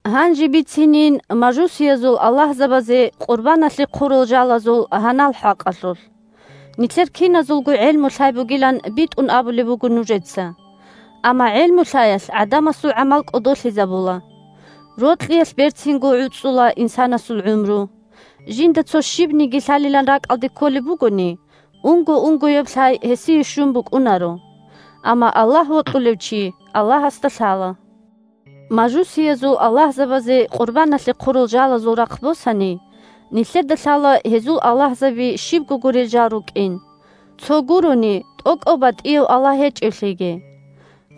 Гьанже бицинин мажусиязул аллагьзабазе къурбаналъе хъурал жалазул гьанал хӀакъалъулъ. Нилъер киназулго гӀелму-лъай бугилан битӀун абулеб буго нужеца. Амма гӀелму-лъаялъ гӀадамасул гӀамал кӀодолъизабула. Рокьиялъ берцинго гӀуцӀула инсанасул гӀумру. Жинда цо щибниги лъалилан ракӀалде кколеб бугони, унго-унгояб лъай гьесие щун букӀунаро. Амма Аллагь вокьулев чи Аллагьасда лъала. Мажусиязул аллагьзабазе къурбаналъе хъурал жалазул рахъ босани: нилъеда лъала гьезул аллагьзаби щибго гурел жал рукӀин, цо гурони, тӀокӀав батӀияв Аллагь гьечӀевлъиги.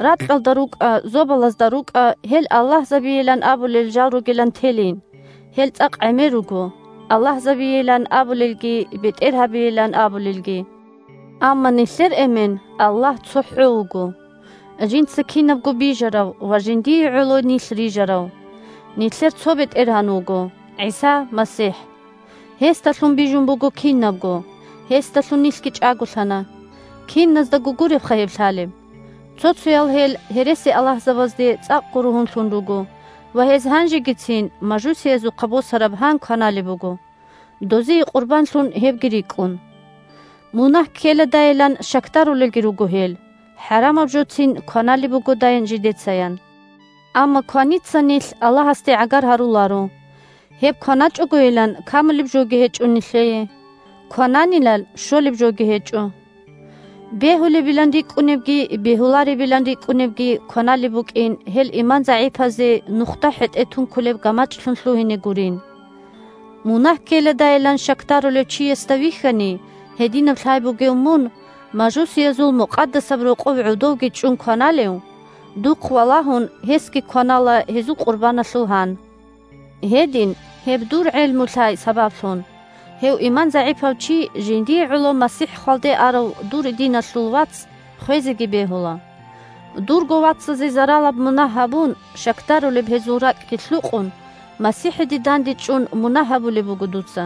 Ракьалда рукӀа, зобалазда рукӀа гьел аллагьзабийилан абулел жал ругилан телин (гьел цӀакъ гӀемер руго – «аллагьзабийилан» абулелги, «бетӀергьабийилан» абулелги). Амма нилъер Эмен – Аллагь цохӀо вуго, жинца кинабго бижарав ва жиндиего гӀоло нилъ рижарав. Нилъер цо бетӀергьан вуго – ГӀиса МасихӀ. Гьесдалъун бижун буго кинабго, гьесдалъун нилъги чӀаголъана. Киназдаго гуребха гьеб лъалеб. Цо-цоял гьел гьересиаллагьзабазде цӀакъго ругьунлъун руго ва гьез гьанжегицин мажусиязухъа босараб гьан кваналеб буго, дозие къурбанлъун гьебги рикӀкӀун. Мунагь ккеладайилан щакдарулелги руго гьел, хӀарамаб жоцин кваналеб бугодай жидецаян. Амма кваница нилъ Аллагьасде гӀагар гьаруларо. Гьеб кваначӀогойилан камулеб жоги гьечӀо нилъее, квананилан щолеб жоги гьечӀо. Бегьулебилан рикӀкӀунебги бегьуларебилан рикӀкӀунебги кваналеб букӀин гьел иман загӀипазе нухда хӀетӀе тункулеб гамачӀлъун лъугьине гурин. Мунагь ккеладайилан щакдарулев чиясда вихьани гьединаб лъай бугев мун мажусиязул мукъадасаб рокъов гӀодовги чӀун кваналев, духъ валагьун, гьесги кванала гьезул къурбаналъул гьан. Гьедин гьеб дур «гӀелму-лъай» сабаблъун – гьев иман загӀипав чи – жиндие гӀоло МасихӀ хвалде арав дур диналъул вац хвезеги бегьула. Дурго вацазе заралаб мунагь гьабун, щакдарулеб гьезул ракӀги лъукъун, МасихӀиде дандечӀун мунагь гьабулеб буго дуца.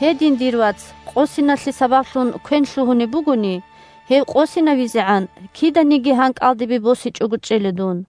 Гьедин, дир вац къосиналъе сабаблъун квен лъугьунеб бугони, гьев къосинавизегӀан, киданиги гьан кӀалдибе босичӀого чӀела дун!